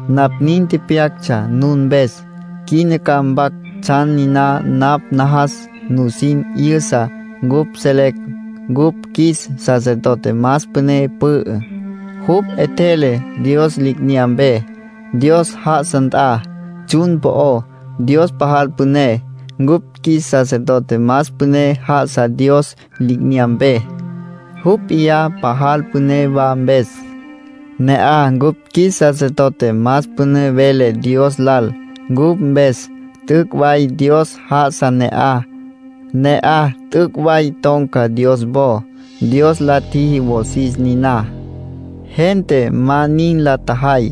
Napj nin tepyactsja nun mpes. Quina ca mpac tsjan niná napj najas nusin 'yüsa. Cupj selecj cupj qjuis sacerdote más püné pü'ü. Jupj 'etjele Dios li'inyampe, Dios já'asa nt'a tsjun po'ó. Dios pajal püné. Cupj qjuis sacerdote más püné já'asa Dios li'inyampe, jupj p'iyá pajal püné wa mpes. Ne'aj cupj qjuis sacerdote más püné vele Dios lal cupj mpes. T'üc' way Dios já'asa ne'aj. Ne'aj t'üc' way ton̈ca Dios wo. Dios la tjiji wosis niná; gente ma nin la tjajay.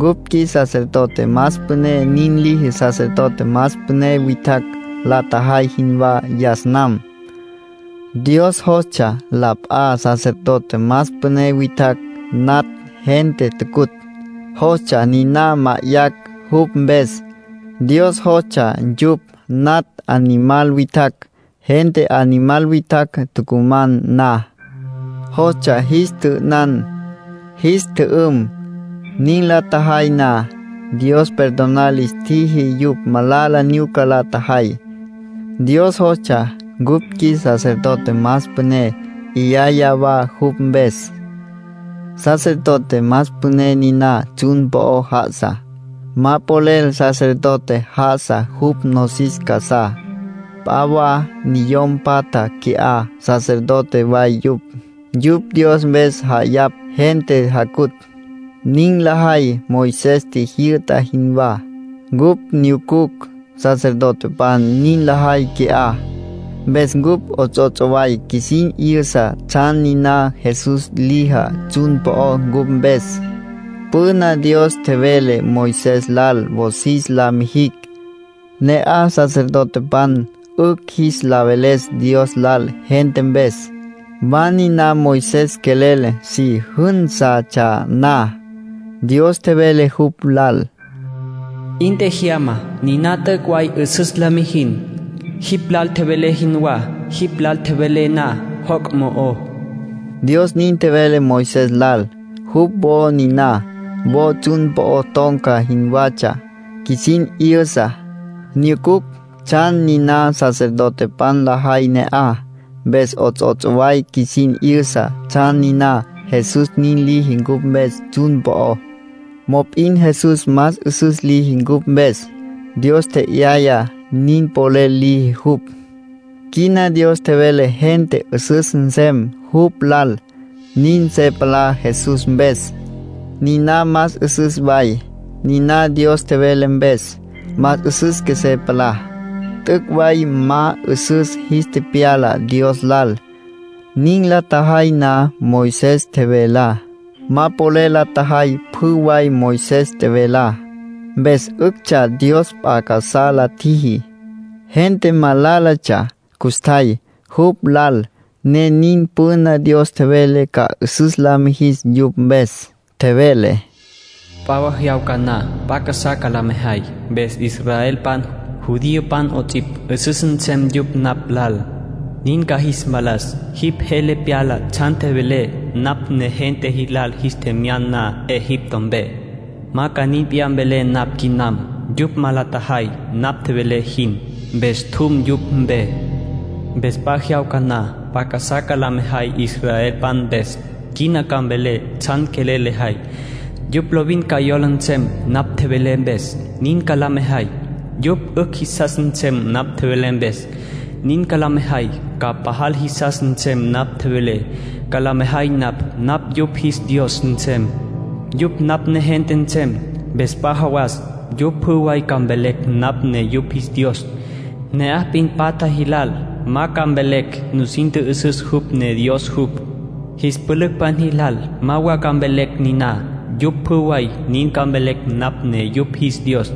Cupj qjuis sacerdote más püné nin liji sacerdote más püné witjacj la tjajay jinwá yas nam. Dios jostsja la p'a sacerdote más püné witjacj natj gente tucutj, jostsja niná ma'ayacj jupj mpes. Dios jostsja yupj natj animal witjacj, gente animal witjacj tucuman na. Jostsja jis tjü'ünan, jis tjü'üm. Nin la tjajay na, Dios perdonar lis tjiji yupj malala nyuca la tjajay. Dios jostsja cupj qjuis sacerdote más püné 'yaya wa jupj mpes. Sacerdote más püné niná tsjun po'o já'asa. Ma polel sacerdote já'asa jupj nosis casá; p'a wa niyom patja qui'á sacerdote way yupj, yupj Dios mpes ja'ayapj gente jacutj. Nin lajay Moisés tjijyü'ta jinwá. Cupj nyucucj sacerdotepan nin lajay qui'á, mpes cupj 'ots'ots' way qjuisin 'yüsa tsjan niná Jesús lijá tsjun po'ó cupj mpes. Püna Dios tjevele Moisés lal wosis la mijicj, ne'aj sacerdotepan 'ücj jis la veles Dios lal gente mpes. Wa niná Moisés quelel si jǘnsatsja na, Dios tjevele jupj lal: “'In tjejyama. Niná t'üc' way 'üsüs la mijin, jipj lal tjevelé jinwá, jipj lal tjevelé na joc' mo'ó.” Dios nin tjevele Moisés lal. Jupj wo niná, wo tsjun po'o ton̈ca jinwatsja, qjuisin 'yüsa. Nyucucj tsjan niná sacerdotepan lajay ne'aj, mpes 'ots'ots' way qjuisin 'yüsa tsjan niná Jesús nin liji cupj mpes tsjun po'ó. Mop'in Jesús más 'üsüs liji cupj mpes; Dios tje'yaya nin polel liji jupj. Quina Dios tjevele gente 'üsüs nsem jupj lal; nin se palá Jesús mpes. Niná más 'üsüs way; niná Dios tjevele mpes, más 'üsüs qjuesé palá. T'üc' way ma 'üsüs jis tepyala Dios lal, nin la tjajay na Moisés tjevelá. Ma polel la tjajay pjü way Moisés tjevelá. Mpes 'üctsja Dios p'a casá la tjiji; gente malálatsja custjay jupj lal, ne nin. Püna Dios tjevele ca 'üsüs la mijis yupj mpes. Tjevele: “P'a jyawca na, p'a casá ca la mejay, mpes israelpan, judiopan 'ots'ipj, 'üsüs nsem yupj napj lal, nin ca jis mpalas. Jipj jele pyala tsjan tjevelé napj negente jilal jis tjemyan na Egipto mpe. Ma ca nin p'iyá mvelé napj quinam. Yupj ma la tjajay napj tjevelé jin. Mpes tjum yupj mpe. Mpes p'a jyawca na, p'a casá ca la mejay israelpan mpes. Quina ca mvelé tsjan quelel lejay. Yupj lovin ca yola nsem napj tjevelé mpes, nin ca la mejay. Yupj 'ücj jisas nsem napj tjevelé mpes, nin ca la mejay. Ca pajal jisas nsem napj tjevelé, ca la mejay napj. Napj yupj jis Dios nsem. Yupj napj negente nsem. Mpes p'a jawas yupj pjü way ca mvelecj napj ne yupj jis Dios. Ne'aj p'in patja jilal ma ca mvelecj nusin tjü'üsüs jupj ne Dios jupj. Jis pülücpan jilal ma wa ca mvelecj niná. Yupj pjü way nin ca mvelecj napj ne yupj jis Dios,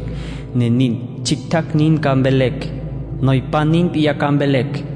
ne nin. Tsjictjacj nin ca mvelecj, noypan nin p'iyá ca mvelecj.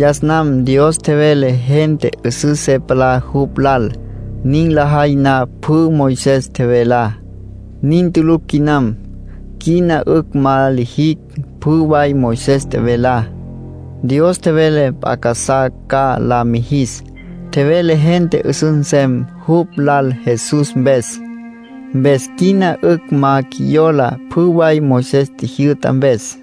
Yas nam Dios tjevele gente 'üsüs se palá jupj lal, nin lajay na pjü Moisés tjevelá. Nin tulucj quinam. Quina 'ücj ma lijicj pjü way Moisés tjevelá. Dios tjevele p'a casá ca la mijis. Tjevele gente 'üsüs nsem jupj lal Jesús mpes. Mpes quina 'ücj ma qjuiyola pjü way Moisés tjijyü'ta mpes.